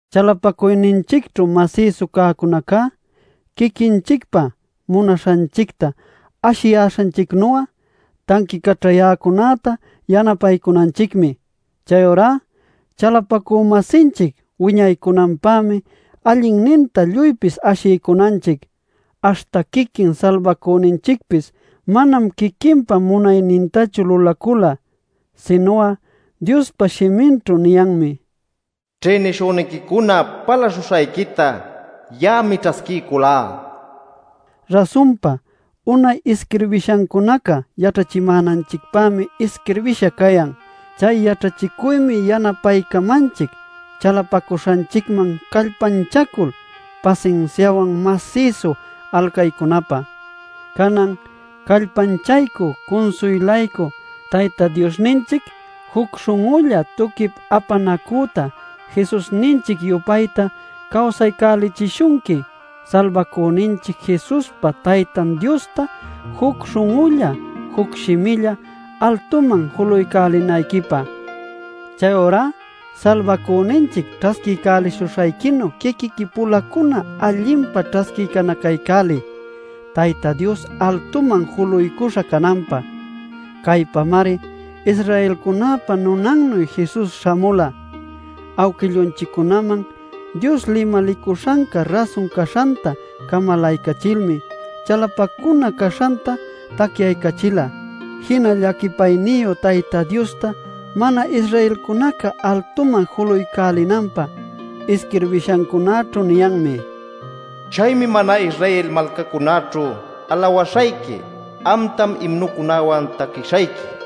Chalapacuyninchicćhu masïsu cäcunaca, quiquinchicpa munaśhanchicta ashiyäśhanchicnu'a tanquicaćhayäcunäta yanapaycunanchicmi. Chayurá chalapacü-masinchic wiñaycunanpämi allinninta lluypis ashiycunanchic. Aśhta quiquin Salbacüninchicpis manam quiquinpa munaynintachu lulacula. Sinu'a Diospa shiminćhu niyanmi: “Ćhïnishüniquicuna palaśhuśhayquita ya'ami ćhasquiyculá” nil. Rasunpa, unay isquirbishancunaca yaćhachimänanchicpämi isquirbïsha cayan. Chay yaćhachicuymi yanapaycamanchic chalapacuśhanchicman callpanchacul, pasinsiawan, masïsu alcaycunapä. Canan, callpanchaycü cunsuylaycü Tayta Diosninchic juc śhun'ulla tuquip apanacüta Jesusninchic-yupayta cawsaycälichishunqui Salbacüninchic Jesuspa Taytan Diosta juc śhun'ulla, juc shimilla altuman julaycälinayquipä. Chayurá Salbacüninchic ćhasquiycälishuśhayquinuy quiquiqui-pulacuna allinpa ćhasquinacaycäliy Tayta Dios altuman juluycuśha cananpä. Caypämari Israelcunäpa nunannuy Jesus śhamula; awquillunchiccunaman Dios limalicuśhanca rasun caśhanta camalaycachilmi chalapacuna caśhanta tacyaycachila, jinal llaquipayniyu Tayta Diosta mana-Israelcunaca altuman julaycälinanpä. Isquirbishancunaćhu niyanmi: “Chaymi mana-Israel malcacunäćhu alawaśhayqui; amtam imnucunawan taquishayqui” nil.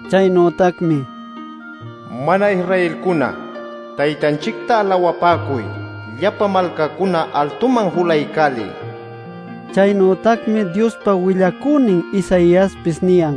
Chaynütacmi: “Mana-Israelcuna Taytanchicta alawapäcuy; llapa malcacuna altuman julaycäliy” niyan. Chaynütacmi Diospa willacünin Isaiaspis niyan: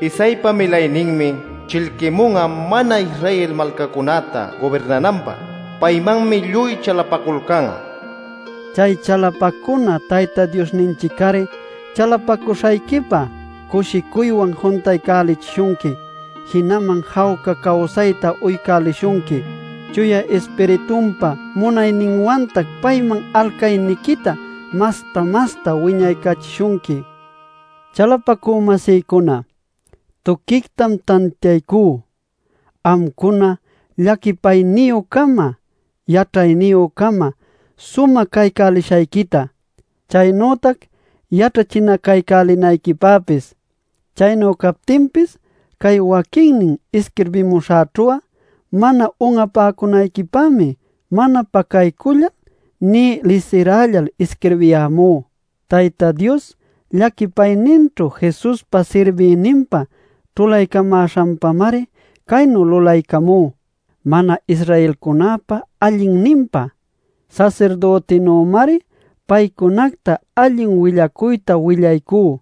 “Isaïpa milayninmi chillquimun'a mana-Israel malcacunacta gubirnananpä. Paymanmi lluy chalapaculcan'a” nil. Chay chalapacuna Tayta Diosninchic-ari chalapacuśhayquipa cushicuywan juntaycälichishunqui, jinaman jawca cawsayta uycälishunqui. Chuya Ispiritunpa munayninwantac payman alcayniquita masta-masta wiñaycachishunqui. Chalapacü-masïcuna, tuquictam tantiaycú amcuna llaquipayniyü-cama yaćhayniyü-cama sumä caycälishayquita, chaynütac yaćhachinacaycälinayquipäpis. Chaynu captinpis cay waquinnin isquirbimuśhäćhu'a mana un'apäcunayquipämi mana pacaycullal nï lisirällal isquirbiyämú. Tayta Dios llaquipayninćhu Jesuspa sirbïninpa ćhulaycamäśhanpamari caynu lulaycamú mana-Israelcunäpa allinninpä. Sasirdütinümari paycunacta allin willacuyta willaycú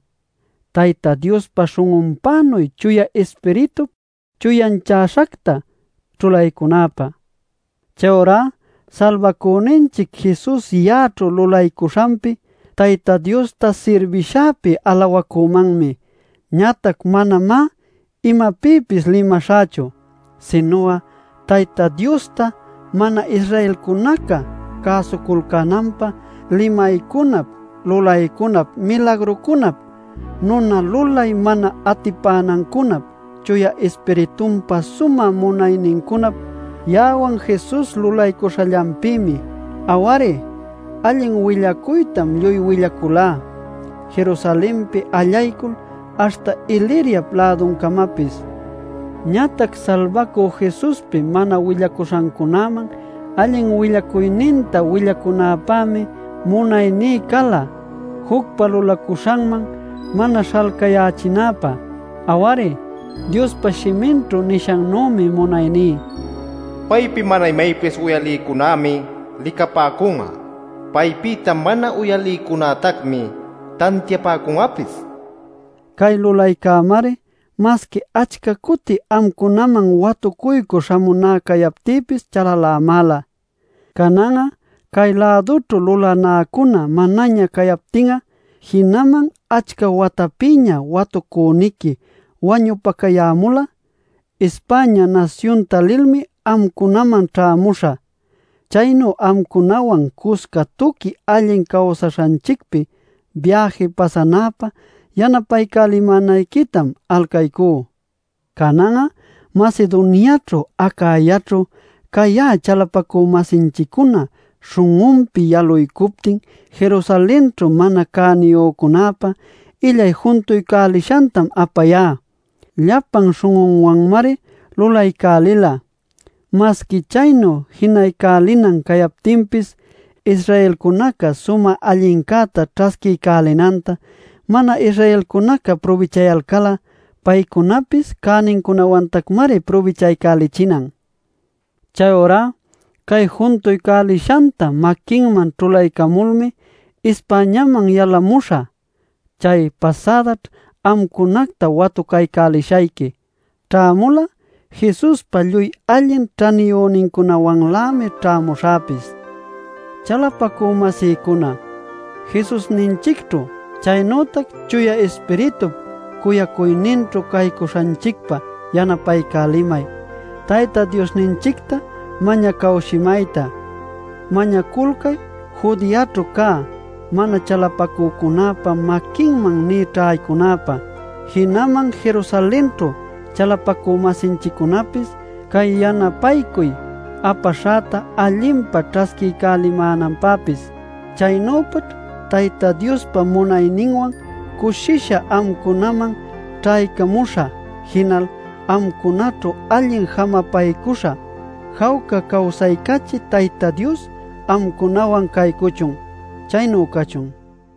Tayta Diospa śhun'unpänuy Chuya Ispiritup chuyanchäśhacta ćhulaycunäpä. Chayurá Salbacüninchic Jesus ya'aćhu lulaycuśhanpi, Tayta Diosta sirbishäpi alawacümanmi. Ñatac manamá imapïpis limaśhächu, sinu'a Tayta Diosta mana-Israelcunaca cäsuculcänanpä, limaycunap lulaycunap milagrucunap nuna lulay mana atipanancunap Chuya Ispiritunpa sumä munaynincunap ya'awan Jesus lulaycuśhallanpïmi. Aw-ari, allin willacuytam lluy willaculá Jerusalenpi allaycul aśhta Iliria-läducamapis. Ñatac Salbacü Jesuspi mana willacuśhancunäman allin willacuyninta willacunäpämi munayní cala jucpa lulacuśhanman mana śhalcayächinäpä. Aw-ari, Diospa shiminćhu nishannümi munayní: “Paypi mana imaypis uyalïcunämi licapäcun'a; paypïta mana uyalïcunätacmi tantiapäcun'apis” nil. Cay lulaycämari, masqui achca cuti amcunaman watucuycü śhamunä cayaptïpis, chalalämäla. Canan'a cay-lädućhu lulanäcunaca manaña cayaptin'a, jinaman achca watapïña watucüniqui wañupacayämul'a, España nasyunta lilmi amcunaman ćhämuśhä. Chaynu amcunawan cusca tuqui allin caycuśhanchicpi, biäji pasanäpä yanapaycälimänayquitam alcaycú. Canan'a Macedoniaćhu Acayaćhu cayä chalapacü-masinchiccuna śhun'unpi yaluycuptin Jerusalenćhu mana cäniyücunäpa illay juntuycälishantam apayá. Llapan śhun'unwanmari lulaycälila, masqui chaynu jinaycälinan cayaptinpis. Israelcunaca sumä allincäta ćhasquiycälinanta mana-Israelcunaca prubichayalcal'a, paycunapis cänincunawantacmari prubichaycälichinan. Chayurá cay juntuycälishanta maquinman ćhulaycamulmi, Españaman yalamuśhä. Chay pasädaćh amcunacta watucaycälishayqui. Ćhämul'a Jesuspa lluy allin ćhaniyünincunawanlämi ćhämuśhäpis. Chalapacü-masïcuna, Jesusninchicćhu chaynütac Chuya Ispiritup cuyacuyninćhu caycuśhanchicpa yanapaycälimay Tayta Diosninchicta mañacawshimayta. Mañaculcay Judeaćhu cä mana chalapacücunäpa maquinman nï ćhaycunäpä, jinaman Jerusalenćhu chalapacü-masinchiccunapis cay yanapaycuy apaśhäta allinpa ćhasquiycälimänanpäpis. Chaynüpaćh Tayta Diospa munayninwan cushisha amcunaman ćhaycamuśhä, jinal amcunaćhu allin jamapaycuśhä. Jawca cawsaycachï Tayta Dios amcunawan caycuchun. Chaynu cachun.